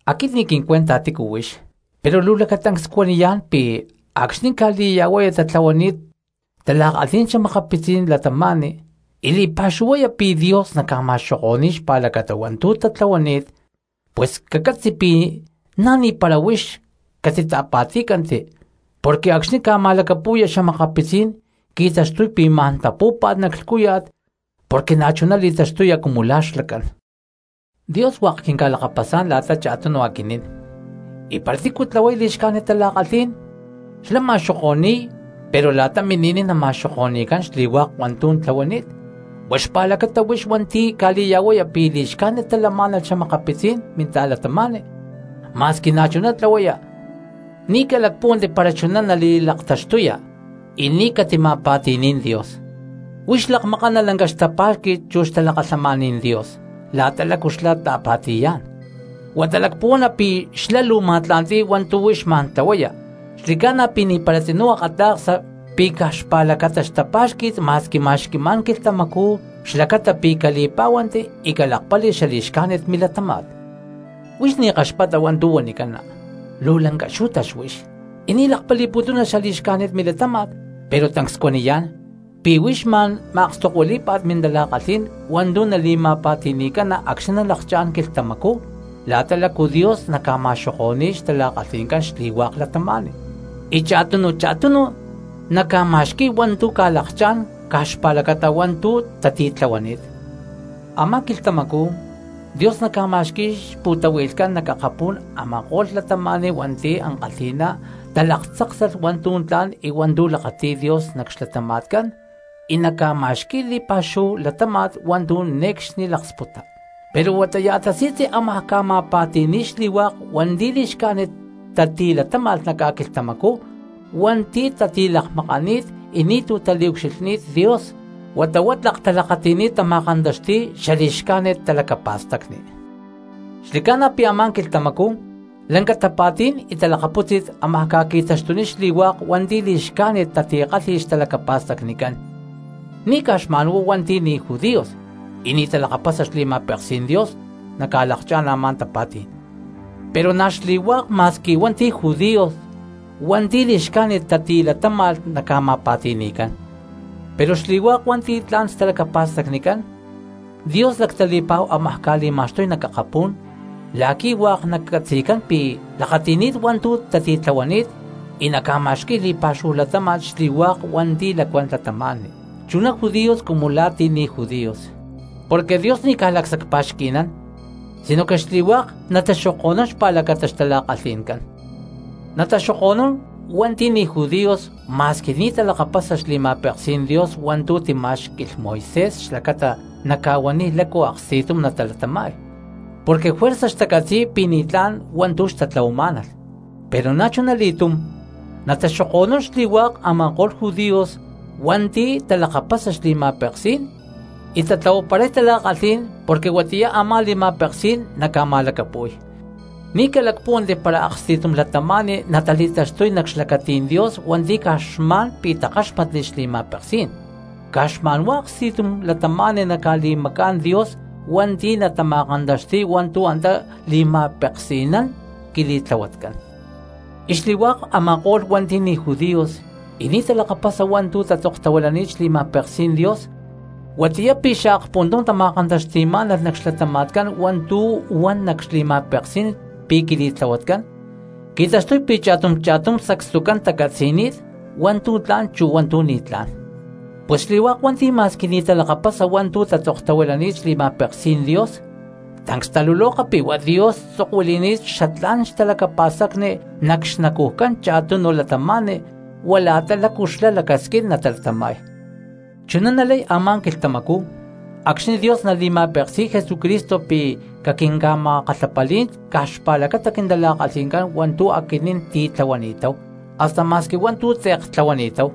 Aquit ni̠ quincuenta tícu huix, pero luu lacatancs cuaniyá̠n pi̠ acxni̠ ca̠li̠ya̠huaya tatlahuani̠t tala̠kalhí̠n xa̠makapitzí̠n cristianos y li̠pa̠xuhuaya pi̠ Dios naca̠ma̠xoko̠ni̠y xpa̠lacata hua̠ntu̠ tatlahuani̠t, pus cacatzi pi̠ na̠ ni̠para huix catita̠pa̠tí̠canti, porque acxni̠ ca̠ma̠lacapu̠ya xa̠makapitzí̠n qui̠taxtuy pi̠ ma̠n tapú̠pa̠t nac lhcúya̠t porque na̠chuná li̠taxtuya cumu la̠ xlacán. Dios hua̠k quinca̠lakapasá̠n la̠ta cha̠tunu aquinín, y para tícu tlahuay li̠xcájnit tala̠kalhí̠n xlá ma̠xoko̠ni̠y pero la̠ta mini̠niy nama̠xoko̠ni̠cán xli̠hua̠k hua̠ntu̠ tlahuani̠t. Huá xpa̠lacata huix hua̠nti̠ ca̠li̠ya̠huaya pi̠ li̠xcájnit talamá̠nalh xa̠makapitzí̠n minta̠cristianos ma̠squi na̠chuná tlahuaya, ni̠ calacpúhuanti para chuná nali̠laktaxtuya y ni̠ catima̠pati̠ní̠n Dios. Huix lakmakana lanca xtapá̠xqui̠t chu xtalakalhamaní̠n Dios la̠ta lácu xlá ta̠pa̠ti̠yá̠n, huata lacpuhuana pi̠ xlá luu ma̠tla̠nti̠y hua̠ntu̠ huix ma̠n tlahuaya; ¡xli̠ca̠na pi̠ ni̠para tzinú akata̠ksa pi̠ caj xpa̠lacata xtapá̠xqui̠t ma̠squi ma̠xqui̠má̠n quilhtamacú xlacata pi̠ cali̠pá̠huanti y calakpali xali̠xcájnit milatáma̠t! Pero huix ni̠ kaxpata hua̠ntu̠ huanicana, luu lanca xú̠tax huix, y ni̠ lakpali̠putuna xali̠xcájnit milatáma̠t: pero tancs cuaniyá̠n pi̠ huix ma̠n ma̠akstokuilí̠pa̠t mintala̠kalhí̠n hua̠ntu̠ nali̠ma̠pa̠ti̠ni̠cana acxni̠ nalakchá̠n quilhtamacú la̠ta lácu Dios naca̠ma̠xoko̠ni̠ko̠y xtala̠kalhi̠ncán xli̠hua̠k cristianos, y cha̠tunu cha̠tunu naca̠ma̠xqui̠y hua̠ntu̠ ca̠lakchá̠n caj xpa̠lacata hua̠ntu̠ tati̠tlahuani̠t. Amá quilhtamacú Dios nacá̠ma̠xqui̠y xpu̠tahui̠lhcán nac akapú̠n a̠ma̠ko̠lh cristianos hua̠nti̠ ankalhi̠ná talaktzáksalh hua̠ntu̠ tla̠n y hua̠ntu̠ lakati̠y Dios nac xlatama̠tcán y naca̠ma̠xqui̠y li̠pa̠xúhu latáma̠t hua̠ntu̠ ne̠cxni laksputa. Pero huatá ya̠ tasi̠tzi ámaj ca̠ma̠pa̠ti̠ni̠y xli̠hua̠k hua̠nti̠ li̠xcájnit tatilatáma̠lh nac ca̠quilhtamacú hua̠nti̠ tatilakmakani̠t y ni̠tu̠ taliucxilhni̠t Dios, huata huá tlak talakati̠ni̠t tama̠kantaxti̠y xali̠xcájnit talacapa̠stacni. Xli̠ca̠na pi̠ a̠má quilhtamacú lanca tapa̠tí̠n y talakapútzi̠t ámaj ca̠qui̠taxtuniy xli̠hua̠k hua̠nti̠ li̠xcájnit tatikálhi̠lh xtalacapa̠stacnicán, ni̠caj xma̠nhuá hua̠nti̠ ni̠ judíos y ni̠ talakapasa xli̠ma̠peksí̠n Dios naca̠lakchá̠n a̠má tapa̠tí̠n, pero na̠ xli̠hua̠k ma̠squi hua̠nti̠ judíos hua̠nti̠ li̠xcájnit tati̠latáma̠lh naca̠ma̠pa̠ti̠ni̠cán. Pero xli̠hua̠k hua̠nti̠ tla̠n xtalacapa̠stacnicán, Dios lactali̠pa̠hu ámaj ca̠li̠ma̠xtuy nac akapú̠n la̠qui̠ hua̠k nacatzi̠cán pi̠ lakati̠ni̠t hua̠ntu̠ tatitlahuani̠t, y naca̠ma̠xqui̠y li̠pa̠xúhu latáma̠t xli̠hua̠k hua̠nti̠ lacuán cristianos, chuná judíos cumu la̠ ti̠ ni̠ judíos. Porque Dios ni̠ caj lacsacpa̠xqui̠nán sinoque xli̠hua̠k nataxoko̠nún xpa̠lacata xtala̠kalhi̠ncán. Nataxoku̠nún hua̠nti̠ ni̠ judíos ma̠squi ni̠ xtalakapasa xli̠ma̠peksí̠n Dios hua̠ntu̠ timá̠xqui̠lh Moisés xlacata naca̠huaniy lácu aksti̠tum natalatama̠y, porque juerza xtacatzi̠y pi̠ ni̠tlá̠n xtatlahuamá̠nalh. Pero na̠chuna li̠túm nataxoko̠nún xli̠hua̠k a̠ma̠ko̠lh judíos hua̠nti̠ talakapasa xli̠ma̠peksí̠n y tatlahuaparay tala̠kalhí̠n porque huatiyá a̠má li̠ma̠peksí̠n naca̠ma̠lacapu̠y. Ni̠ calacpúhuanti para aksti̠tum cristiano natali̠taxtuy nac xlacatí̠n Dios hua̠nti̠ caj xma̠n pi̠ takáxmatli xli̠ma̠peksí̠n, caj xma̠nhuá aksti̠tum cristiano naca̠li̠macá̠n Dios hua̠nti̠ natama̠kantaxti̠y hua̠ntu̠ antá li̠ma̠peksi̠nán quili̠tlahuatcán. Y xli̠hua̠k a̠ma̠ko̠lh hua̠nti̠ ni̠ judíos y ni̠ talakapasa hua̠ntu̠ tatzoktahuilani̠t xli̠ma̠peksí̠n Dios, huatiyá pi̠ xaakpuntum tama̠kantaxti̠má̠nalh nac xlatáma̠t hua̠ntu̠ huan nac xli̠ma̠peksí̠n pi̠ quili̠tlahuatcán, qui̠taxtuy pi̠ cha̠tum cha̠tum sacstucán tacatzi̠ni̠t hua̠ntu̠ tla̠n chu hua̠ntu̠ ni̠tlá̠n. Pus xli̠hua̠k hua̠nti̠ ma̠squi ni̠ talakapasa hua̠ntu̠ tatzoktahuilani̠t xli̠ma̠peksí̠n Dios, tancs taluloka pi̠ huá Dios tzokuili̠ni̠t xatlá̠n xtalacapa̠stacni nac xnacujcán cha̠tunu cristianos huá la̠ta lácu xlá lacasquín natalatama̠y. Chuná nalay a̠má quilhtamacú acxni̠ Dios nali̠ma̠peksi̠y Jesucristo pi̠ caquinca̠ma̠kalhapalí̠n caj xpa̠lacata quintala̠kalhi̠ncán hua̠ntu̠ aquinín ti̠tlahuani̠táhu, hasta ma̠squi hua̠ntu̠ tze̠k tlahuani̠táhu.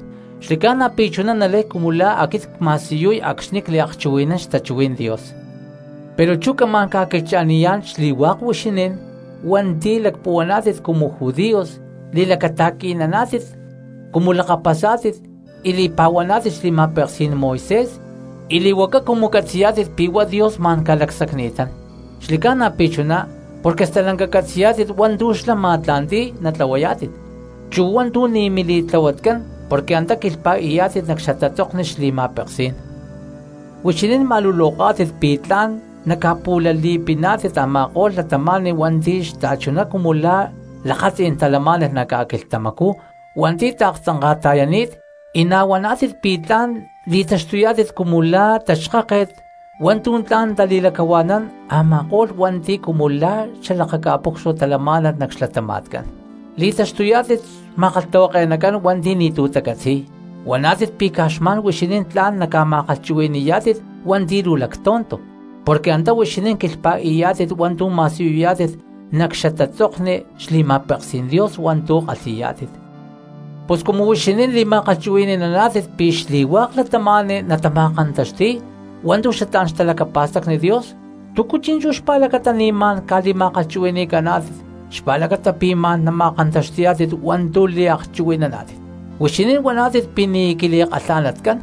Xli̠ca̠na pi̠ chuná nalay cumu la̠ aquit cma̠siyuy acxni̠ cliakchuhui̠nán xtachuhuí̠n Dios. Pero chú camá̠n ca̠quilhcha̠niyá̠n xli̠hua̠k huixinín hua̠nti̠ lacpuhuaná̠tit cumu judíos, li̠lacata̠qui̠naná̠tit cumu lakapasá̠tit y li̠pa̠huaná̠tit xli̠ma̠peksí̠n Moisés y li̠huaca cumu catzi̠yá̠tit pi̠ huá Dios ma̠n ca̠lacsacni̠tán. Xli̠ca̠na pi̠ chuná porque stalanca catzi̠yá̠tit hua̠ntu̠ xlá ma̠tla̠nti̠y natlahuayá̠tit, chu hua̠ntu̠ ni̠ mili̠tlahuatcán porque antá quilhpa̠i̠yá̠tit nac xatatzokni xli̠ma̠peksí̠n. Huixinín ma̠luloká̠tit pi̠ tla̠n naca̠pu̠lali̠piná̠tit a̠ma̠ko̠lh cristianos hua̠nti̠ xta̠chuná cumu la̠ lakatzí̠n talamá̠nalh nac ca̠quilhtamacú hua̠nti̠ taaktzanka̠ta̠yani̠t, y na̠ huaná̠tit pi̠ tla̠n nali̠taxtuyá̠tit cumu la̠ taxkáket hua̠ntu̠ tla̠n natali̠lacahua̠nán a̠ma̠ko̠lh cristianos hua̠nti̠ cumu la̠ xalakaca̠pucsua talamá̠nalh nac xlatama̠tca̠n. Li̠taxtuyá̠tit xma̠kalhtahuake̠nacán hua̠nti̠ ni̠tu̠ tacatzi̠y, huaná̠tit pi̠ caj xma̠n huixinín tla̠n naca̠ma̠kalhchuhui̠ni̠yá̠tit hua̠nti̠ luu lactonto, porque antá huixinín quilhpa̠i̠yá̠tit hua̠ntu̠ ma̠siyuyá̠tit nac xatatzokni xli̠ma̠peksí̠n Dios hua̠ntu̠ kalhi̠yá̠tit. Pus cumu huixinín li̠ma̠kalhchuhui̠ni̠naná̠tit pi̠ xli̠hua̠k cristianos natama̠kantaxti̠y hua̠ntu̠ xatlá̠n xtalacapa̠stacni Dios, ¿túcu chi̠nchú xpa̠lacata ni̠ ma̠n ca̠li̠ma̠kalhchuhui̠ni̠caná̠tit xlacata pi̠ ma̠n nama̠kantaxti̠yá̠tit hua̠ntu̠ liakchuhui̠naná̠tit? Huixinín huaná̠tit pi̠ ni̠ quili̠kalha̠natcán,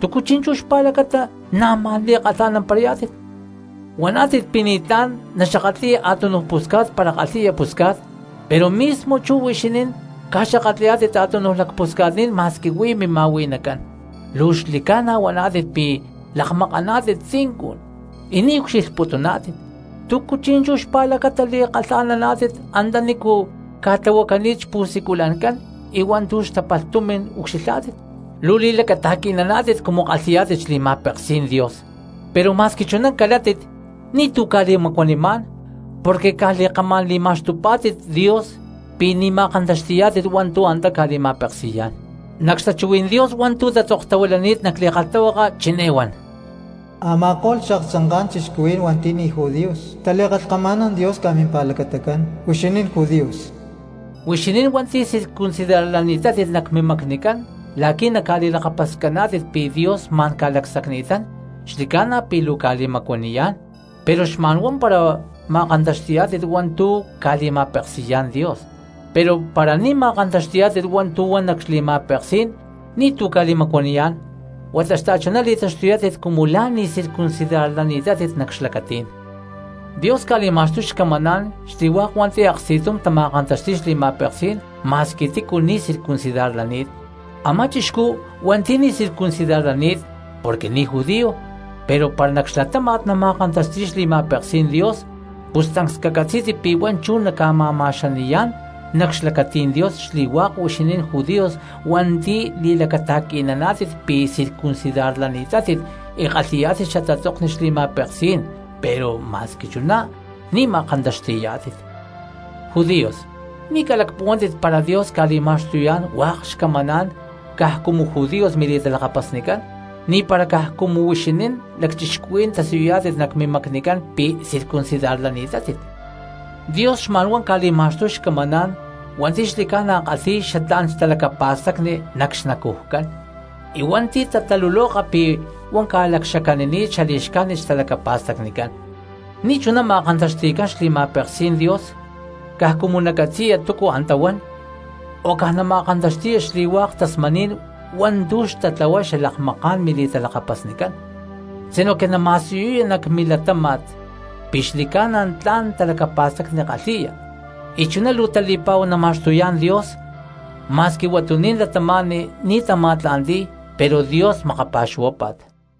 ¿túcu chi̠nchú xpa̠lacata na̠ ma̠n li̠kalha̠namparayá̠tit? Huaná̠tit pi̠ ni̠tlá̠n naxakatli̠ya a̠túnuj pusca̠t para kalhi̠ya puscá̠t, pero mismo chú huixinín ca̠xakatli̠yá̠tit a̠túnuj lacpusca̠tní̠n ma̠squi huí mima̠hui̠nacán. Luu xli̠ca̠na huaná̠tit pi̠ lakmakaná̠tit tzincun y ni̠ ca̠ucxilhputuná̠tit, ¿túcu chi̠nchú xpa̠lacata li̠kalha̠naná̠tit antanícu ca̠tlahuanicani̠t xpu̠siculancán y hua̠ntu̠ xtapalh tumi̠n ucxilhá̠tit? Luu li̠lacata̠qui̠naná̠tit cumu kalhi̠yá̠tit xli̠ma̠peksí̠n Dios pero ma̠squi chuná calátit ni̠tu̠ ca̠li̠macuanimá̠n porque caj li̠kamá̠n li̠ma̠xtupá̠tit Dios porque ni̠ ma̠kantaxti̠yá̠tit hua̠ntu̠ antá ca̠li̠ma̠peksi̠yá̠n. Nac xtachuhuí̠n Dios hua̠ntu̠ tatzoktahuilani̠t nac li̠kalhtahuaka chiné huán: “Ama̠ko̠lh xaaktzanká̠n cristianos hua̠nti̠ ni̠ judíos tali̠kalhkama̠nán Dios caj mimpa̠lacatacán huixinín judíos.” Huixinín hua̠nti̠ circuncidarlani̠tátit nac xmacnicán la̠qui̠ naca̠li̠lakapascaná̠tit pi̠ Dios ma̠n ca̠lacsacni̠tán, xli̠ca̠na pi̠ luu ca̠li̠macuaniyá̠n pero xma̠nhuá para ma̠kantaxti̠yá̠tit hua̠ntu̠ ca̠li̠ma̠peksi̠yá̠n Dios, pero para ni̠ ma̠kantaxti̠yá̠tit hua̠ntu̠ huan nac xli̠ma̠peksí̠n ni̠tu̠ ca̠li̠macuaniyá̠n huata xta̠chuná li̠taxtuyá̠tit cumu la̠mpara ni̠ circuncidarlani̠tátit nac xlacatí̠n. Dios ca̠li̠ma̠xtuy xcamaná̠n xli̠hua̠k hua̠nti̠ aksti̠tum tama̠kantaxti̠y xli̠ma̠peksí̠n ma̠squi tícu ni̠ circuncidarlani̠t. Amá chixcú hua̠nti̠ ni̠ circuncidarlani̠t porque ni̠ judío, pero para nac xlatáma̠t nama̠kantaxti̠y xli̠ma̠peksí̠n Dios, pus tancs cacatzí̠tit pi̠ huá chú naca̠ma̠ma̠xani̠yá̠n nac xlacatí̠n Dios xli̠hua̠k huixinín judíos hua̠nti̠ li̠lacata̠qui̠naná̠tit pi̠ circuncidarlani̠tátit y kalhi̠yá̠tit xatatzokni xli̠ma̠peksí̠n pero ma̠squi chuná ni̠ ma̠kantaxti̠yá̠tit. Judíos, ni̠ calacpuhuántit para Dios ca̠li̠ma̠xtuyá̠n hua̠k xcamaná̠n caj cumu hua̠k judíos mili̠talakapasnicán, na̠ ni̠para caj cumu huixinín lacchixcuhuí̠n tasiyuy nac mimacnicán pi̠ circuncidarlani̠tátit. Porque Dios xma̠nhuá ca̠li̠ma̠xtuy xcamaná̠n hua̠nti̠ xli̠ca̠na kalhi̠y xatlá̠n xtalacapa̠stacni nac xnacujcán y hua̠nti̠ tataluloka pi̠ huá ca̠lacxacanini̠t xali̠xcájnit xtalacapa̠stacnicán. Porque ni̠chuná ma̠kantaxti̠cán xli̠ma̠peksí̠n Dios caj cumu nacatzi̠ya túcu antá huán, o caj nama̠kantaxti̠ya xli̠hua̠k tasmaní̠n hua̠ntu̠ xtatlahuay xalakmaká̠n mili̠talakapasnicán, sinoque nama̠siyuya nac milatáma̠t pi̠ xli̠ca̠na tla̠n talacapa̠stacni kalhi̠ya, y chuná luu tali̠pa̠hu nama̠xtuyá̠n Dios ma̠squi huatuní̠n cristianos ni̠ tama̠tla̠nti̠y pero Dios makapa̠xuhuápa̠t.